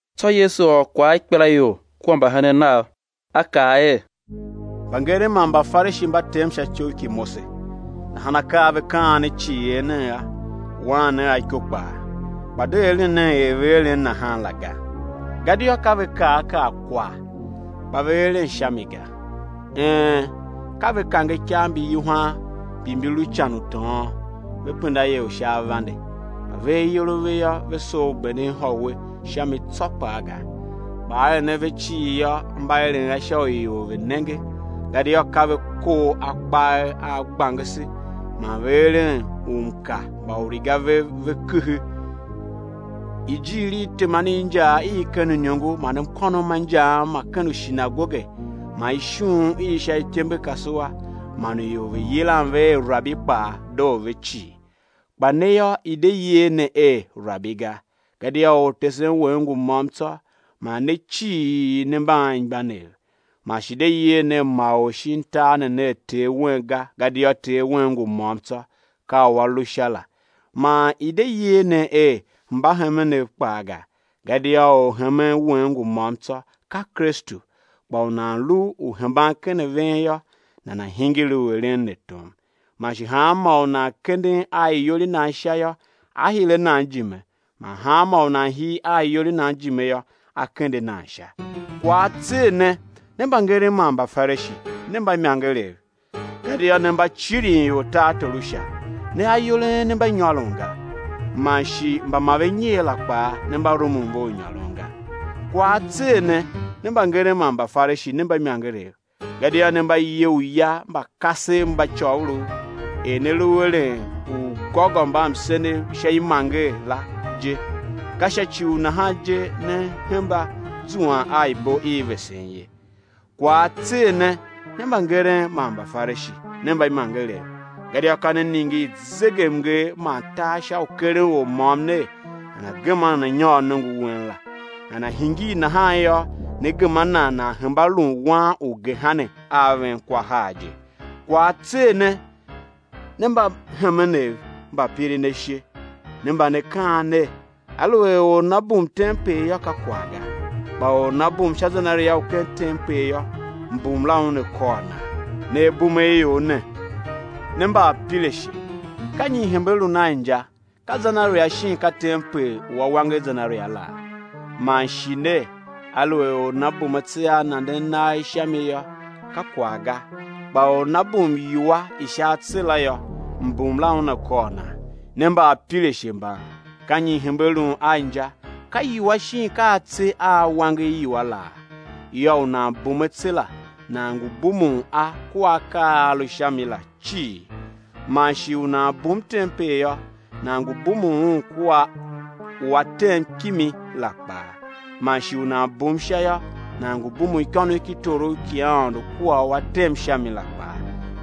Tsô Yesu ôr kwagh a ikpelaior kua mbahenen Nav, A kaa er: Mbangeren man Mbafarishi mba tem sha ityough ki Mose. Nahan akaa a ve kaan ne cii, er nen a, waan nen iko kpaa, kpa de eren nen er ve eren nahan la ga; gadia ka ve kaa a kaa kwagh, kpa ve eren sha mi ga. Een, ka ve kange ikav mbi yuhwan mbi mbi lu ican u tôôn, ve penda ior sha avande, kpa ve ayol a ve yô, ve soo u benden ihôwe sha mi tsô kpaa ga. Kpa aeren a ve cii yô, mba eren a sha u ior ve̱ nenge; gadia ka ve kor akpagher a gbangese, man ve eren umka mba uriga vev ve kehe. Ijiir i teman i injaa i ken uiniongo man mkônom ma injaam ma ken ushinagoge, man ishughun i sha ityembekasua man u ior ve yilan ve er, rabi kpaa, doo ve cii. Kpa ne yô, i̱ de yer ne er, rabi, ga, gadia Ortesen wen ngu môm tsô, man ne cii ne mba anmgbianev. Man shi de yer nen ma or shin tar ne ner ter wen ga, gadia Ter wen ngu môm tsô, ka u A lu Sha la. Man i̱ de yer ne er, mbahemenev, kpaa ga, gadia Orhemen wen ngu môm tsô, ka Kristu. Kpa u nan lu u hemban ken a ven yô, nana̱ hingir u eren ne tom. Man shi hanmô u nan kenden a iyol i nan sha yô, á hire a nan ijime; man hanmô u nan hir a iyol i nan ijime yô, á kende a nan sha. Kwagh á tser ne, ne mbangeren man Mbafarishi, ne mbaimangerev, gadia ne mba cirin ior tartor u Sha; ne ayol a en ne mba nyôron ga, man shi mba ma ve nyer la kpaa, ne mba rumun ve u nyôron ga. Kwagh á tser ne, ne mbangeren man Mbafarishi, ne mbaimangerev, gadia ne mba ye uya mba kasev mba côgholov, er ne lu eren ugôgômbamsenev sha imanger la je; ka sha ci u nahan je ne hemba zuan a ibo i vesen ye. Kwagh á tser ne, ne mbangeren man Mbafarishi, ne mbaimangerev, gadia ka ne ningir zegemnger man tar sha u keren or môm ner, nana gema nana nyôr nongo wen la; nana hingir nahan yô, ne gema nan, nan hemba lun wan u gehena, a ven kwa har je. Kwagh á tser ne, ne mbahemenev mba pirin ashe, ne mba ne kaan ner: Aluer or nana bum tempel yô, ka kwagh ga; kpa or nana bum sha zenaria u ken tempel yô, mbum la una kôr nan. Ne abumeaior ne, ne mbaapirashe! Ka nyi i hembe lun a inja, ka zenaria shin ka tempel u a wanger zenaria laa? Man shi ner: Aluer or nana bum atse a nanden nagh sha mi yô, ka kwagh ga; kpa or nana bum iwua i sha atse la yô, mbum la una kôr nan. Ne mbaapirashe mban! Ka nyi i hembe lun a inja, ka iwua shin ka atse a a wanger iwua laa? Yô, u nan bum atse la, nan ngu bumun a kua akaa a a lu sha mi la cii. Man shi u nan bum tempel yô, nan ngu bumun un kua u A tem kimi la kpaa. Man shi u nan bum Sha yô, nan ngu bumun ikônough ki torough ki Aôndo kua u A tem sha mi la kpaa.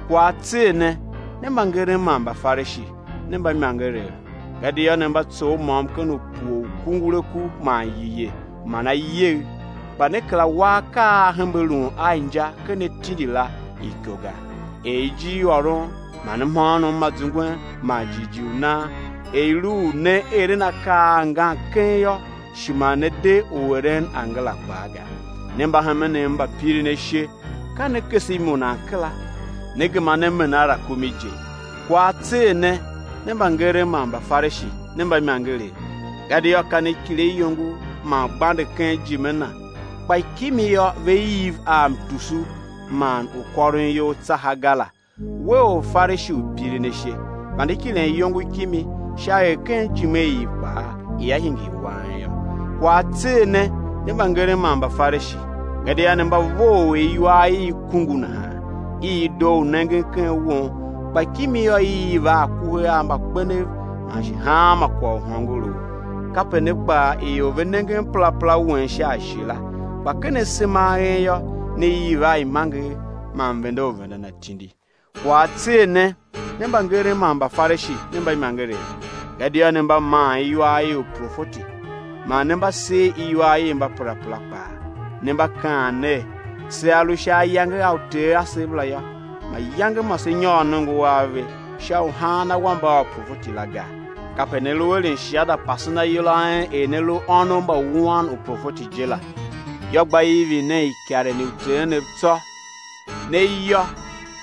Kwagh á tser ne, ne mbangeren man Mbafarishi, ne mbaimangerev. Gadia ne mba tsough môm-ken-upue u kunguraku man yiye man ayegh, kpa ne kera wa akaa a a hembe lun a inja ken atindi la iko ga, er: ijirôron man mhôônom ma zungwen man jighjigh u nan, er i lu u né eren akaa ngan keng yô, shi ma ne de u eren angara kpaa ga. Ne mbahemenev mba pirin ashe, ka ne kese imunan kera, ne gema ne mena rakumi je. Kwagh á tser ne, ne mbangeren man Mbafarishi, ne mbaimangerev! Gadia ka ne kile iyongo man gbande ken ijime na, kpa kimi yô, ve iv a mtusu man u kôron iyol tsaha ga la. We Orfarishi u pirin ashe, vande kilen iyongo kimi, sha er ken ijime i i kpaa ia hingir wang yô. Kwagh á tser ne, ne mbangeren man Mbafarishi! Gadia ne mba vough er iwar i i kungu nahan, i i doo u nengen ken won, kpa kimi yô, i iv a akuhe a mbakpenev man shi hanma kwagh u hôngorough. Kape ne kpaa ior ve nengen perapera wen sha ashe la, kpa ken asema a en yô, ne iv a imanger man mvende u vendan atindi. Kwagh á tser ne, ne mbangeren man Mbafarishi, ne mbaimangerev! Gadia ne mba maan iwar i uprofeti man ne mba ser iwar i mbaperapera kpaa, Ne mba kaan ner: Sea lu sha ayange a uter asev la yô, mayange ma se nyôr nongo a ve sha u haan awambe a uprofeti, la ga. Kape ne lu eren shiada pasen ayol a en er ne lu ônov mba mbawuan uprofeti je la. Yô, gba ivin nen ikaren i uter enev tsô. Ne iyô,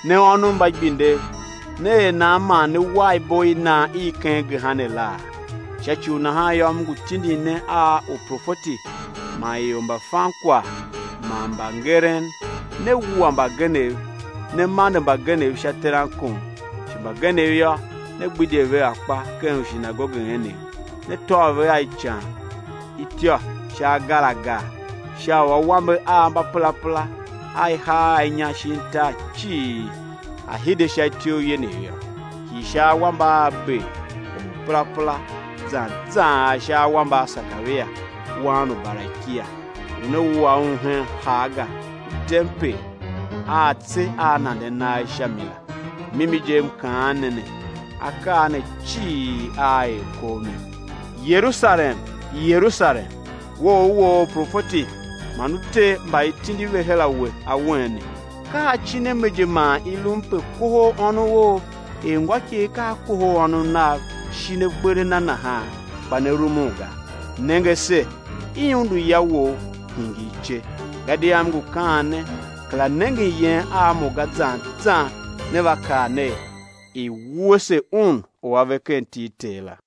ne ônov mba igbindev! Né er nan man né war ibo i nan i ken gehena la? Sha ci u nahan yô, M ngu tindin ne a uprofeti man ior mba fan kwagh man mbangeren; né wua mbagenev, né mande mbagenev sha terankon, shi mbagenev yô, né gbidye ve akpa ken ushinagoge enev, né tôv ve a ican ityô sha agar agar; sha u awambe a mbaperapera a i haa a inya shin tar cii a̱ hide sha ityouv yenev yô, hii sha awambe a Abel, or u perapera, zan zan ar sha awambe a Sekaria, wan u Barakia, u ne wua un hen harga u tempel a atse a nanden nagh sha mi la. Mimi je M kaan ne ne, akaa ne cii aa er kov ne. Yerusalem, Yerusalem, we u u woo uprofeti man u te mba i tindi ve her a we, awen ne; ka acin a me je man i lum pe kohol ônov er ngôikegh ka a kohol ônov nav shin akper a na nahan, kpa ne rumun ga! Nenge ase, i undu ya wou, hingir ice. Gadia M ngu kaan ne, kera nengen yen a Mo ga zan zan né va kaa ner: I̱ wuese Un u A ve ken iti i Ter la.